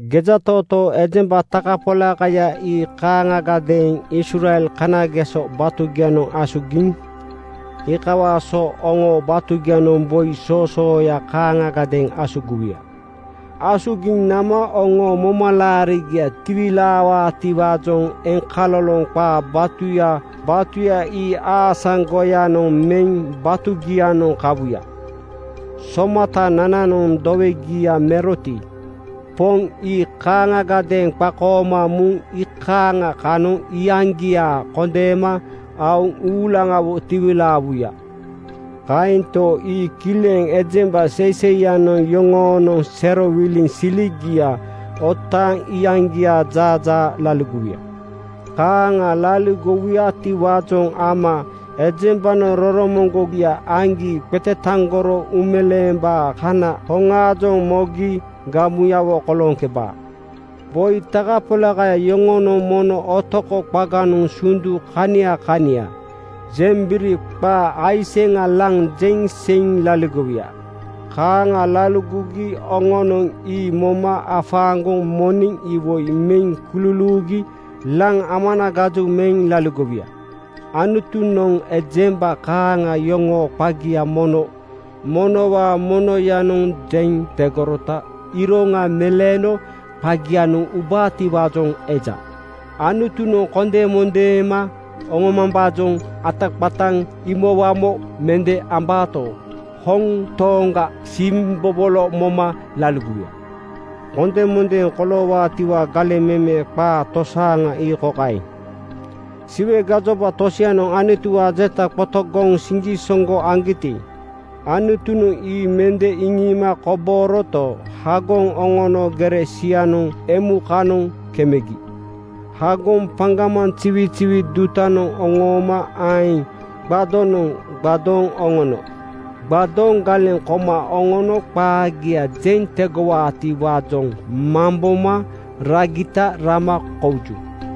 Gejatootoo ejemba takapolakaya ii kaaŋagadeeŋ Israel kanageso batugianoŋ asugigi. Iikawaa so oŋoo batugianoŋ boi soosooya kaaŋagadeeŋ asugiwuya. Asugiŋ nama oŋoo momalaarigia tiwilaawaatiwaajoŋ eŋkaloloŋ qaa batuya batuya ii aasaŋgoyanoŋ meŋ batugianoŋ kawuya. Somatanananoŋ dowegia meroti, Poŋ ii kaaŋagadeeŋ qakooma muŋ iikaaŋa kanoŋ iyaŋgia kondeema aoŋ uulaŋawo tiwilaawuya. Kaento, ii kileŋ ejemba seiseiyanoŋ yoŋoonoŋ serowiliŋ siligia otaaŋ iyaŋgiaa jaajaa laligowuya. Kaaŋa laligowuyatiwaajoŋ ama ejembanoŋ roromoŋgogia aŋgi qetetaŋgoro uumeleembaa kana hoŋaajoŋ mogi gamuyawo kolooŋkebaa. Boi takapolakaya yoŋonoŋ mono otoko qaganoŋ sundu kania kania jembiri (qaa aiseŋa) laŋ jeŋ seiŋ laligowuya. Kaaŋa laligogi oŋonoŋ ii moma afaaŋgoŋ moneŋ iwoi meŋ kululuugi laŋ amanagaju meŋ laligowuya. Anutu-noŋ ejemba kaaŋa yoŋoo qaagia mono monowaa monoyanoŋ jeŋ tegorota iroŋa meleeno qagianoŋ ubaatiwaajoŋ eja. Anutunoŋ kondemondeema oŋomambaajoŋ ataqataŋ imowamo mende ambaato, hoŋ tooŋaga siimbobolo moma laligowuya. Kondemondeeŋ koloowaatiwaa galeŋ meme qaa tosaaŋa ii kokaeŋ: Siwe gajoba tosianoŋ Anutuwaa jeta qotogoŋ siŋgisoŋgo aŋgiti, Anutunoŋ ii mende iŋiima kobooroto, hagoŋ oŋono gere sianoŋ emukanoŋ kemegi. Hagoŋ paŋgamaŋ ziwiziwi dutanoŋ oŋooma aeŋ gbadonoŋ (tape) gbadooŋ oŋono. Gbadooŋ galeŋ koma oŋono qaagia jeŋ tegowaatiwaajoŋ mamboma ragita rama kouju.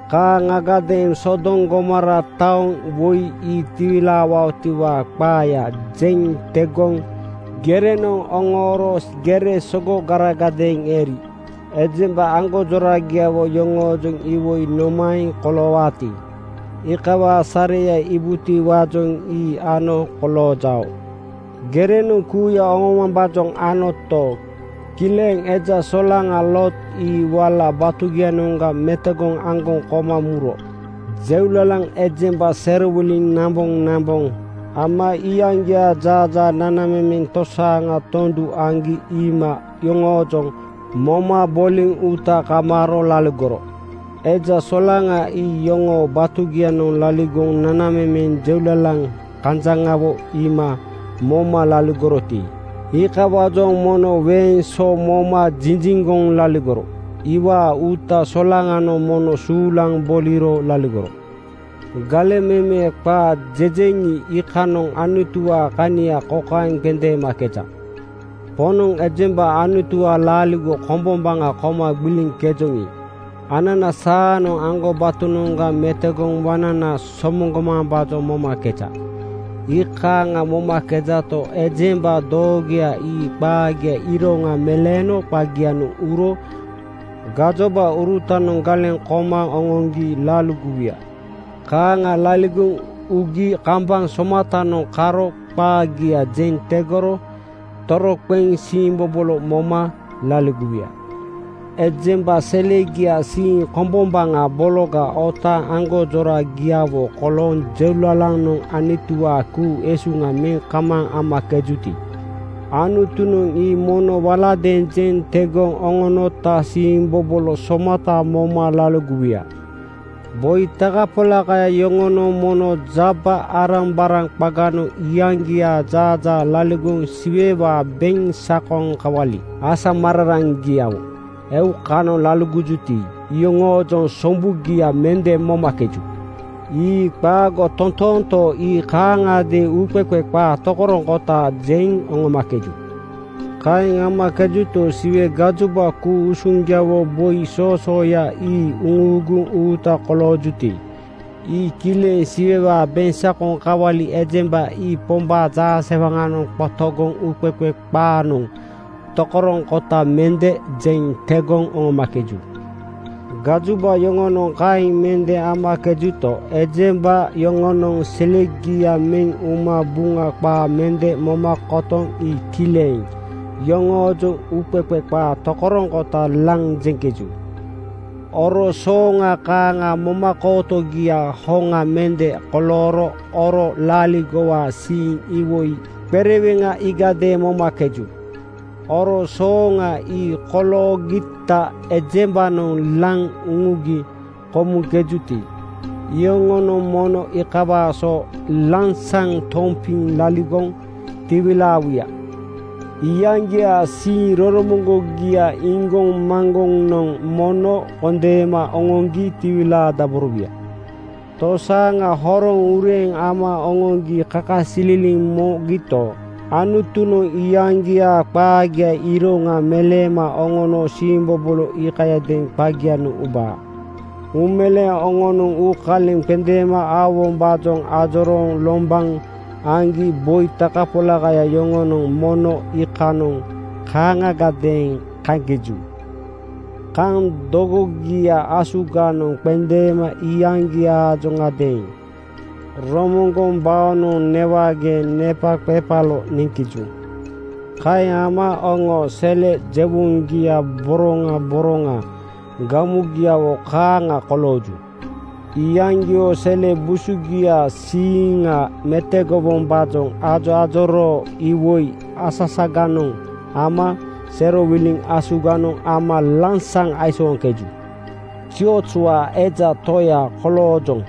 Kaaŋagadeeŋ Sodom Gomora taoŋ woi ii tiwilaawaotiwaa qaaya jeŋ tegoŋ gerenoŋ oŋooro gere sogogaragadeeŋ eri. Ejemba aŋgonjoragiawo yoŋoojoŋ iwoi nomaeŋ koloowaati, iikawaa sareya iibutiwaajoŋ ii ano koloojao. Gerenoŋ kuuya oŋoomambaajoŋ anoto, kileŋ eja solaŋa Loot ii wala batugianoŋga metogoŋ aŋgoŋ koma muro. Jeulalaŋ ejemba serowiliŋ namboŋnamboŋ ama iyaŋgiaa jaajaa nanamemeŋ tosaaŋa tondu aŋgi iima yoŋoojoŋ moma boliŋ uuta kamaaro laligoro. Eja solaŋa ii yoŋoo batugianoŋ laligoŋ nanamemeŋ jeulalaŋ kanjaŋawo iima moma laligoroti, iikawaajoŋ mono weeŋ so moma jinjiŋgoŋ laligoro. Iwaa uuta solaŋanoŋ mono suulaŋ boliro laligoro. Galeŋ meme qaa jejeŋi, iikanoŋ Anutuwaa kania kokaeŋ qendeemakeja: Poŋnoŋ ejemba Anutuwaa laaligo kombombaŋa koma gbiliŋkejoŋi, anana saanoŋ aŋgobatonoŋga metogoŋ waŋnana somoŋgomambaajoŋ momakeja. Iikaaŋ momakejato, ejemba doogoya ii qaagiaa iroŋa meleeno qagianoŋ uro gajobaurutanoŋ galeŋ koma oŋoŋgi laligowuya. Kaaŋa laligoŋ ugi kambaŋ somatanoŋ karo qaagia jeŋ tegoro toroqeŋ siimbobolo moma laligowuya. Ejemba selegiaa siiŋ kombombaŋa bologa otaaŋ aŋgonjora-giawo kolooŋ jeulalanoŋ Anutuwaa ku-usuŋa meŋ kamaaŋ amakejuti, Anutunoŋ ii mono waladeeŋ jeŋ tegoŋ oŋonota siimbobolo somata moma laligowuya. Boi takapolakaya yoŋonoŋ mono jaba-arambaraŋ qaganoŋ iyaŋgiaa jaajaa laligoŋ Siwewaa beŋsakoŋ kawali asamararaŋgiawo eukanoŋ laligojuti, iyoŋoojoŋ sombugia mende momakeju. Ii qaago totoonto, ii kaaŋagadeeŋ uuqeqe qaa tokoroŋkota jeŋ oŋomakeju. Kaeŋ amakejuto, Siwe gajoba ku-usuŋgiawo boi soosooya ii uŋuuguŋ uuta koloojuti, ii kileŋ Siwewaa beŋsakoŋ kawali ejemba ii Pombaa jaasewaŋanoŋ qotogoŋ uuqeqe qaanoŋ tokoroŋkota mende jeŋ tegoŋ oŋomakeju. Gajoba yoŋonoŋ kaeŋ mende amakejuto, ejemba yoŋonoŋ selegia meŋ uma Buŋa qaa mende moma kotoŋ ii kileŋ yoŋoojoŋ uuqeqe qaa tokoroŋkota laŋ jeŋkeju. Oro sooŋa kaaŋa momakootogia hoŋa mende kolooro oro laaligowaa siiŋ iwoi qereweŋa iigadeeŋ momakeju. Oro sooŋa ii koloogita ejembanoŋ laŋ uŋugi komuŋkejuti, iyoŋonoŋ mono iikawaa so lansaŋ tompiŋ laligoŋ tiwilaawuya. Iyaŋgiaa siiŋ roromoŋgogia iŋgoŋmaŋgoŋanoŋ mono kondeema oŋoŋgi tiwilaadaborowuya. Tosaaŋa horoŋ ureeŋ ama oŋoŋgi kakasililiŋ mogito, Anutunoŋ iyaŋgiaa qaagiaa iroŋa meleema oŋono siimbobolo iikayadeeŋ qagianoŋ ubaa. Uumeleeŋ oŋonoŋ uukaleŋ qendeema aowombaajoŋ ajorooŋ lombaŋ aŋgi boi takapolakaya yoŋonoŋ mono iikanoŋ kaaŋagadeeŋ kaŋkeju. Kaŋ dogogia asuganoŋ qendeema iyaŋgiaajoŋadeeŋ romoŋgoŋ baonoŋ newageeŋ nepaqepalo neŋkeju. Kaeŋ ama oŋoo sele jewoŋgia boroŋa boroŋa gamugiawo kaaŋa kolooju. Iyaŋgio sele busugiaa siiŋa metogowombaajoŋ ajoajoroo iwoi asasaganoŋ ama serowiliŋ asuganoŋ ama lansaŋ aisooŋkeju. “Ziozwaa eja toya koloojoŋ,”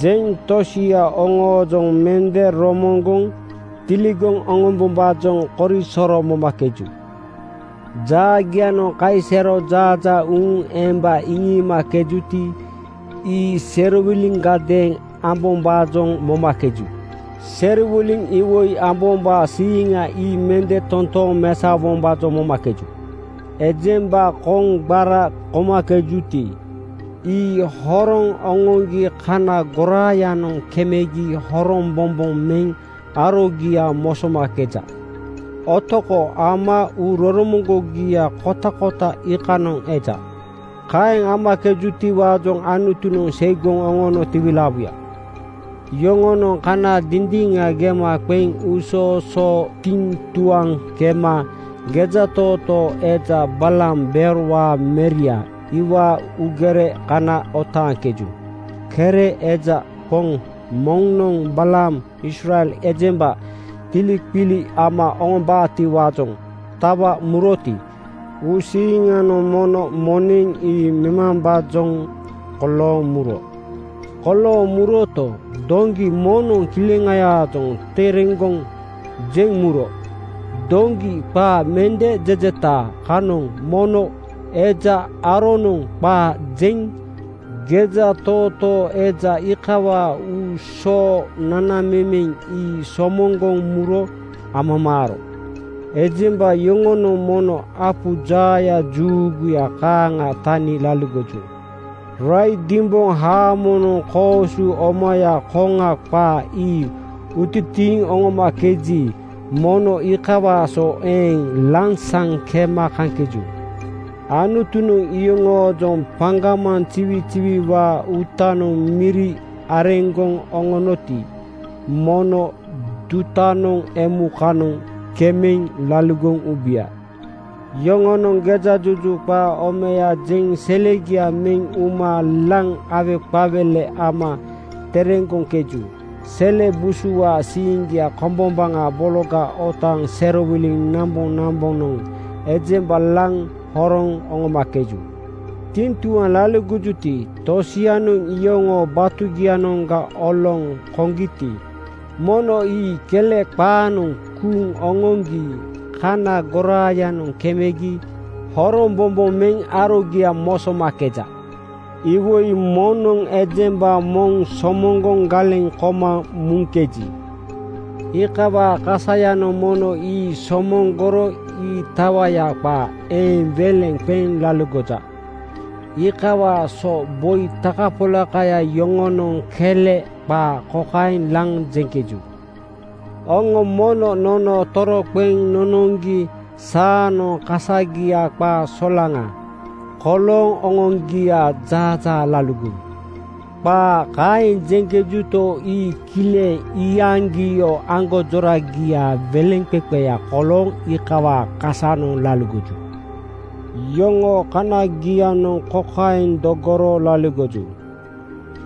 jeŋ tosia oŋoojoŋ mende romoŋgoŋ tiligoŋ oŋombombaa korisoro momakeju. Jaagianoŋ kaisero jaajaa uuŋ emba iŋiimakejuti, ii serowiliŋgadeeŋ ambombaajoŋ momakeju. Serowiliŋ iwoi ambombaa siiŋa ii mende totooŋ mesaowombaajoŋ momakeju. Ejemba koŋgbara komakejuti, ii horoŋ oŋoŋgi kana goraayanoŋ kemegi horombobo meŋ arogia mosomakeja. Otoko ama uuroromoŋgogia kotakota iikanoŋ eja. Kaeŋ amakejutiwaajoŋ Anutunoŋ seigoŋ oŋono tiwilaawuya. Yoŋonoŋ kana dindiŋa gema qeŋ uusoosoo tiŋtuaŋ kema gejatootoo eja Balaam Beorwaa meria iwaa uugere kana otaaŋkeju. Kere eja poŋ moŋnoŋ Balaam Israel ejemba tiliqili ama oŋombaatiwaajoŋ tawa muroti, uusiiŋanoŋ mono moneŋ ii memambaajoŋ kolooŋ muro. Kolooŋ muroto, doŋgi moŋnoŋ kileŋayaajoŋ tereŋgoŋ jeŋ muro. Doŋgi qaa mende jejeta kanoŋ mono eja aronoŋ qaa jeŋ gejatootoo eja iikawaa uusoo nanamemeŋ ii somoŋgoŋ muro amamaaro. Ejemba yoŋonoŋ mono apu jaaya juuguya kaaŋa tani laligoju. Raidimboŋ haamonoŋ koosu omaya koŋa qaa ii utitiiŋ oŋomakeji, mono iikawaa so eeŋ lansaŋ kema kaŋkeju. Anutunoŋ yoŋoojoŋ paŋgamaŋ ziwiziwiwaa uutanoŋ miri areŋgoŋ oŋonoti, mono dutanoŋ emukanoŋ kemeŋ laligoŋ ubuya. Yoŋonoŋ gejajuju qaa omaya jeŋ selegia meŋ uma laŋ aweqawele ama tereŋgoŋkeju. Sele busuwaa siiŋgia kombombaŋa bologa otaaŋ serowiliŋ namboŋnambonoŋ ejemba laŋ horoŋ oŋomakeju. Tiŋtuaŋ laligojuti, tosianoŋ iyoŋoo batugianoŋga oloŋ koŋgiti, mono ii kele qaanoŋ kuuŋ oŋoŋgi kana goraayanoŋ kemegi horombobo meŋ arogia mosomakeja. Iwoi moŋnoŋ ejemba moŋ somoŋgoŋ galeŋ koma muŋkeji, iikawaa kasayanoŋ mono ii somoŋgoro ii tawaya qaa eeŋ weleŋ qeŋ laligoja. Iikawaa so boi takapolakaya yoŋonoŋ kele qaa kokaeŋ laŋ jeŋkeju, “Oŋo mono nono toroqeŋ nonoŋgi saanoŋ kasagia qaa solaŋa (frii) kolooŋ oŋoaŋgiaa jaajaa laligowu.” Qaa kaeŋ jeŋkejuto, ii kileŋ iyaŋgio aŋgonjoragiaa weleŋqeqeya kolooŋ iikawaa kasanoŋ laligoju. Yoŋoo kaniagianoŋ kokaeŋ dogoro laligoju: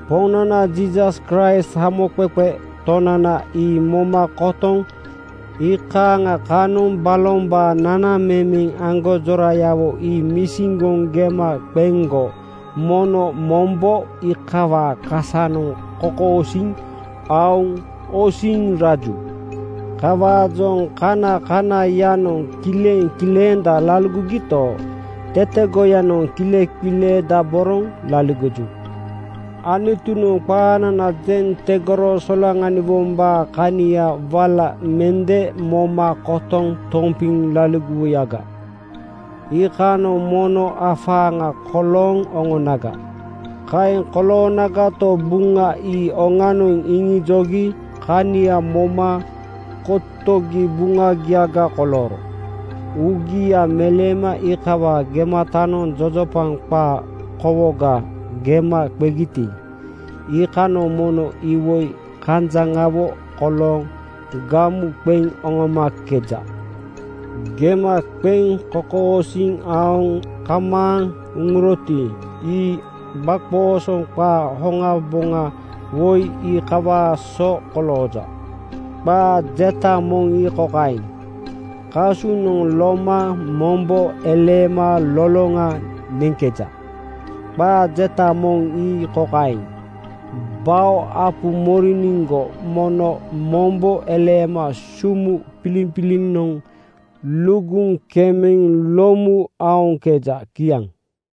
Poŋnana Jiisas Kraist Hamoqeqe Tonana ii moma kotoŋ iikaaŋa kanoŋ balombaa nanamemeŋ aŋgonjorayawo ii misiŋgoŋ gema qeŋgo mono mombo iikawaa kasanoŋ kokosiiŋ aoŋ osiŋ raju. Kawaajoŋ kanakanaiyanoŋ kileŋkilenda laligogito, tetegoyanoŋ kileqileedaboroŋ laligoju. Anutunoŋ qaanana jeŋ tegoro solaŋaniwombaa kania wala mende moma kotoŋ tompiŋ laligowuyaga, iikanoŋ mono afaaŋa kolooŋ oŋonaga. Kaeŋ koloonagato, Buŋa ii oŋanoŋ iŋijogi kania moma kotogi buŋagiaga kolooro. Uugia meleema iikawaa gematanoŋ jojopaŋ qaa kowoga gema qegiti, iikanoŋ mono iwoi kanjaŋawo kolooŋ gamu qeŋ oŋomakeja. Gema qeŋ kokosiiŋ aoŋ kamaaŋ uŋuroti, ii gbaqoosoŋ qaa hoŋaboŋa woi iikawaa so kolooja. Qaa jeta moŋ ii kokaeŋ, “Kasunoŋ loma mombo eleema loloŋa neŋkeja.” Qaa jeta moŋ ii kokaeŋ, “Bao apu moriniŋgo mono mombo eleema sumu piliŋpilinoŋ luguŋ kemeŋ lomu aoŋkeja.” Kiaŋ.